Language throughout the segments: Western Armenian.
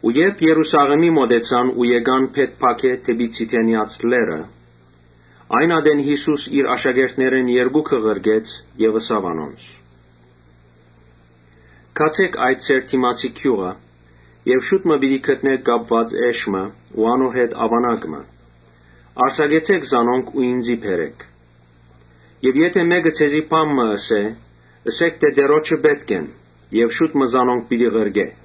Երբ Երուսաղէմի մօտեցան ու եկան Բեթփագէ՝ դէպի Ձիթենեաց լեռը՝ այն ատեն Յիսուս իր աշակերտներէն երկուքը ղրկեց Եւ ըսաւ անոնց. «Գացէք այդ ձեր դիմացի գիւղը եւ հոն պիտի գտնէք կապուած էշ մը ու անոր հետ աւանակ մը. արձակեցէք զանոնք ու ինծի բերէք։ Եթէ մէկը ձեզի բան մը ըսէ, ըսէք թէ ‘Տէրոջը պէտք են’. եւ շուտ մը զանոնք պիտի ղրկէ»։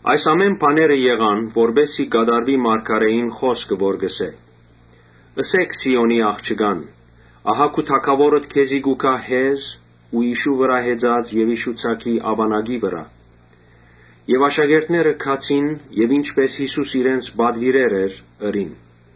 Այս ամէն բաները եղան, որպէս զի կատարուի մարգարէին խօսքը որ կ’ըսէ. «Ըսէք Սիօնի աղջկան. ‘Ահա քու Թագաւորդ քեզի կու գայ, հեզ ու իշու վրայ հեծած եւ իշու ձագի, աւանակի, վրայ’։ Աշակերտները գացին եւ ինչպէս Յիսուս իրենց պատուիրեր էր՝ ըրին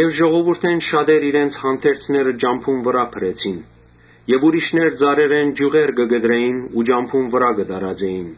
Ժողովուրդէն շատեր իրենց հանդերձները ճամբուն վրայ փռեցին եւ ուրիշներ ծառերէն ճիւղեր կը կտրէին ու ճամբուն վրայ կը տարածէին։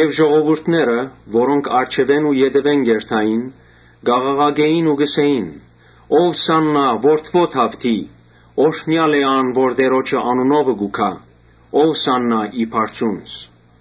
Ժողովուրդը առջեւէն ու ետեւէն կ’երթար, կ’աղաղակէին ու կ’ըսէին. «Ովսա՛ննա, Որդի Դաւթի։ Օրհնեալ է ան որ Տէրոջը անունովը կու գայ. Ովսա՛ննա ի բարձունս»։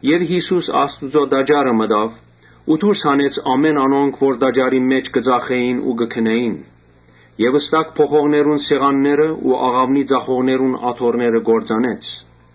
Յիսուս Աստուծոյ տաճարը մտաւ ու դուրս հանեց ամէն անոնք, որ տաճարին մէջ կը ծախէին ու կը գնէին եւ ստակ փոխողներուն սեղաններն ու աղաւնի ծախողներուն աթոռները կործանեց.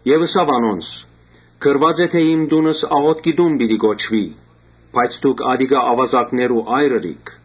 Եւ ըսաւ անոնց. «Գրուած է թէ ‘Իմ տունս աղօթքի տուն պիտի կոչուի’. բայց դուք ատիկա աւազակներու այր ըրիք»։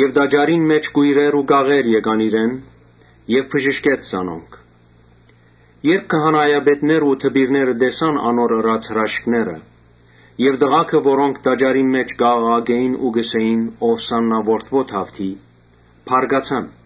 Տաճարին մէջ կոյրեր ու կաղեր եկան իրեն եւ ինք բժշկեց զանոնք։ Երբ քահանայապետներն ու դպիրները տեսան անոր ըրած հրաշքները եւ տղաքը որոնք տաճարին մէջ կ’աղաղակէին ու կ’ըսէին. «Ովսա՛ննա, Որդի Դաւթի», բարկացան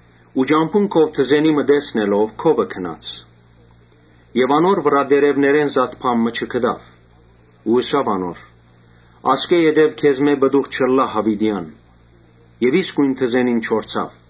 Ճամբուն վրայ թզենի մը տեսնելով քովը գնաց։ Անոր վրայ տերեւներէն զատ բան մը չգտաւ. ու ըսաւ անոր. «Ասկէ յետոյ պտուղ պիտի չտաս յաւիտեան»։ Եւ իսկոյն թզենին չորցաւ։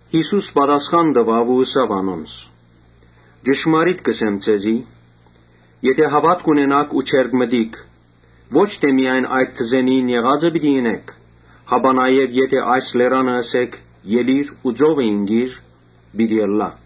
Յիսուս պատասխան տուաւ ու ըսաւ անոնց. «Ճշմարիտ կ’ըսեմ ձեզի. ‘եթէ հաւատք ունենաք ու չերկմտիք, ոչ միայն այդ թզենիին եղածը պիտի ընէք, հապա նաեւ եթէ այս լերանը ըսէք ‘Ելի՛ր ու ծովը ինկիր’, պիտի իյնայ։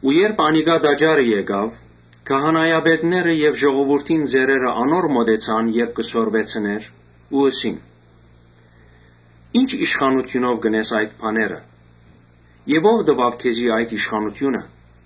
Երբ տաճարը եկաւ, քահանայապետները եւ ժողովուրդին ծերերը անոր մօտեցան՝ երբ կը սորվեցնէր՝ ու ըսին. «Ի՞նչ իշխանութիւնով կ’ընես այդ բաները եւ ո՞վ տուաւ քեզի այդ իշխանութիւնը»։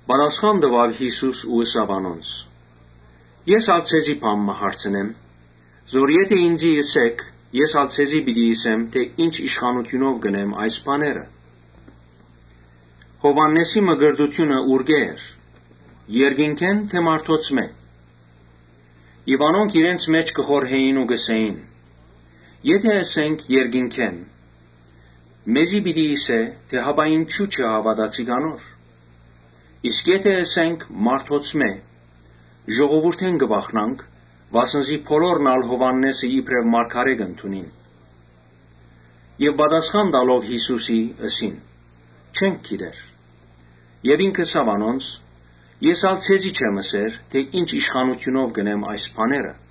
Պատասխան տուաւ Յիսուս ու ըսաւ անոնց. «Ես ալ ձեզի բան մը հարցնեմ, եթէ ինծի ըսէք, ես ալ ձեզի պիտի ըսեմ թէ ի՛նչ իշխանութիւնով կ’ընեմ այս բաները։ Յովհաննէսին մկրտութիւնը ուրկէ՞ էր, երկնքէ՞ն թէ մարդոցմէ»։ Անոնք իրենց մէջ կը խորհէին ու կ’ըսէին. «Եթէ ըսենք՝ ‘Երկինքէն’, մեզի պիտի ըսէ թէ ‘Հապա ինչո՞ւ չհաւատացիք անոր’, իսկ եթէ ըսենք՝ ‘Մարդոցմէ, ժողովուրդէն կը վախնանք’, վասն զի բոլորն ալ Յովհաննէսը իբրեւ մարգարէ կ’ընդունին» Պատասխանեցին Յիսուսին. «Չենք գիտեր»։ Ինք ալ ըսաւ անոնց. «Ես ալ ձեզի չեմ ըսեր թէ ի՛նչ իշխանութիւնով կ’ընեմ այս բաները»։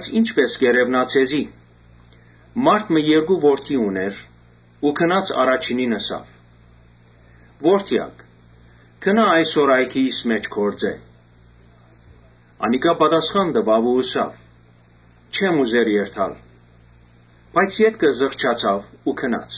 «Ի՞նչպէս կ’երեւնայ ձեզի. մարդ մը երկու որդի ունէր։ Առաջինին ըսաւ. «Որդեա՛կ, գնա այսօր այգիիս մէջ գործէ» Անիկա պատասխանեց. «Չեմ ուզեր երթալ»։ Բայց ետքը զղջաց ու գնաց։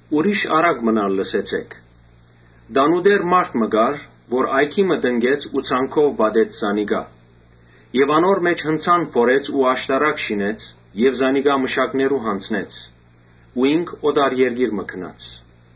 Ուրիշ առակ մըն ալ լսեցէք. «Տանտէր մը կար որ այգի մը տնկեց ու ցանկով պատեց զանիկա եւ անոր մէջ հնձան փորեց ու աշտարակ շինեց եւ զանիկա մշակներու յանձնեց ու ինք օտար երկիր մը գնաց։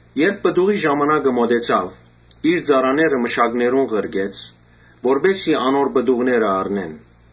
Երբ պտուղի ժամանակը մօտեցաւ, իր ծառաները մշակներուն ղրկեց, որպէս զի անոր պտուղները առնեն։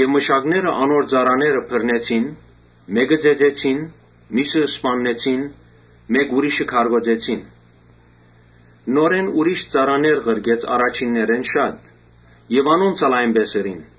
Մշակները անոր ծառաները բռնեցին մէկը ծեծեցին, միւսը սպաննեցին, ուրիշ մը քարկոծեցին։ Նորէն ծառաներ ղրկեց առաջիններէն շատ եւ անոնց ալ նոյնպէս ըրին։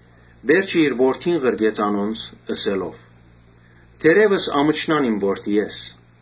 Վերջը իր որդին ղրկեց անոնց, ըսելով՝ ‘Թերեւս ամչնան իմ որդիէս’։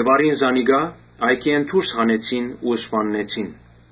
Առին զանիկա, այգիէն դուրս հանեցին ու սպաննեցին։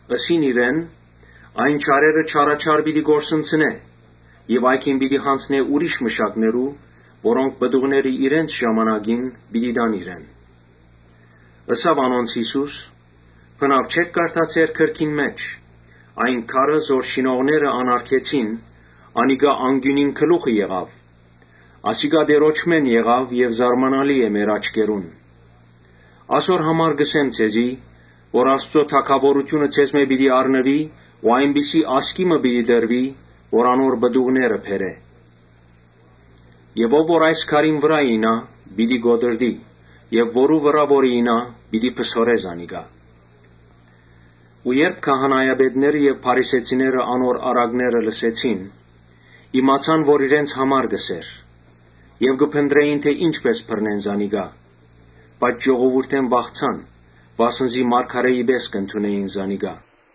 Ըսին իրեն. «Այն չարերը չարաչար պիտի կորսնցնէ եւ այգին պիտի յանձնէ ուրիշ մշակներու, որոնք պտուղները իրենց ժամանակին պիտի տան իրեն»։ Ըսաւ անոնց Յիսուս. «Բնաւ չէ՞ք կարդացեր գրքին մէջ, ‘Այն քարը զոր շինողները անարգեցին, անիկա անկիւնին գլուխը եղաւ’։ Ասիկա Տէրոջմէն եղաւ եւ զարմանալի է մեր աչքերուն։ Ասոր համար կ’ըսեմ ձեզի, թէ Աստուծոյ թագաւորութիւնը ձեզմէ պիտի առնուի ու այնպիսի ազգի մը պիտի տրուի՝ որ անոր պտուղ բերէ։ Ով որ այս քարին վրայ իյնայ, պիտի կոտրտի եւ որու վրայ որ իյնայ պիտի փսորէ զանիկա»։ Երբ քահանայապետները եւ փարիսեցիները անոր առակները լսեցին, իմացան որ իրենց համար կ’ըսէր Եւ կը փնտռէին թէ ի՛նչպէս բռնեն զանիկա, բայց ժողովուրդէն վախցան, վասն զի մարգարէի պէս կ’ընդունէին զանիկա։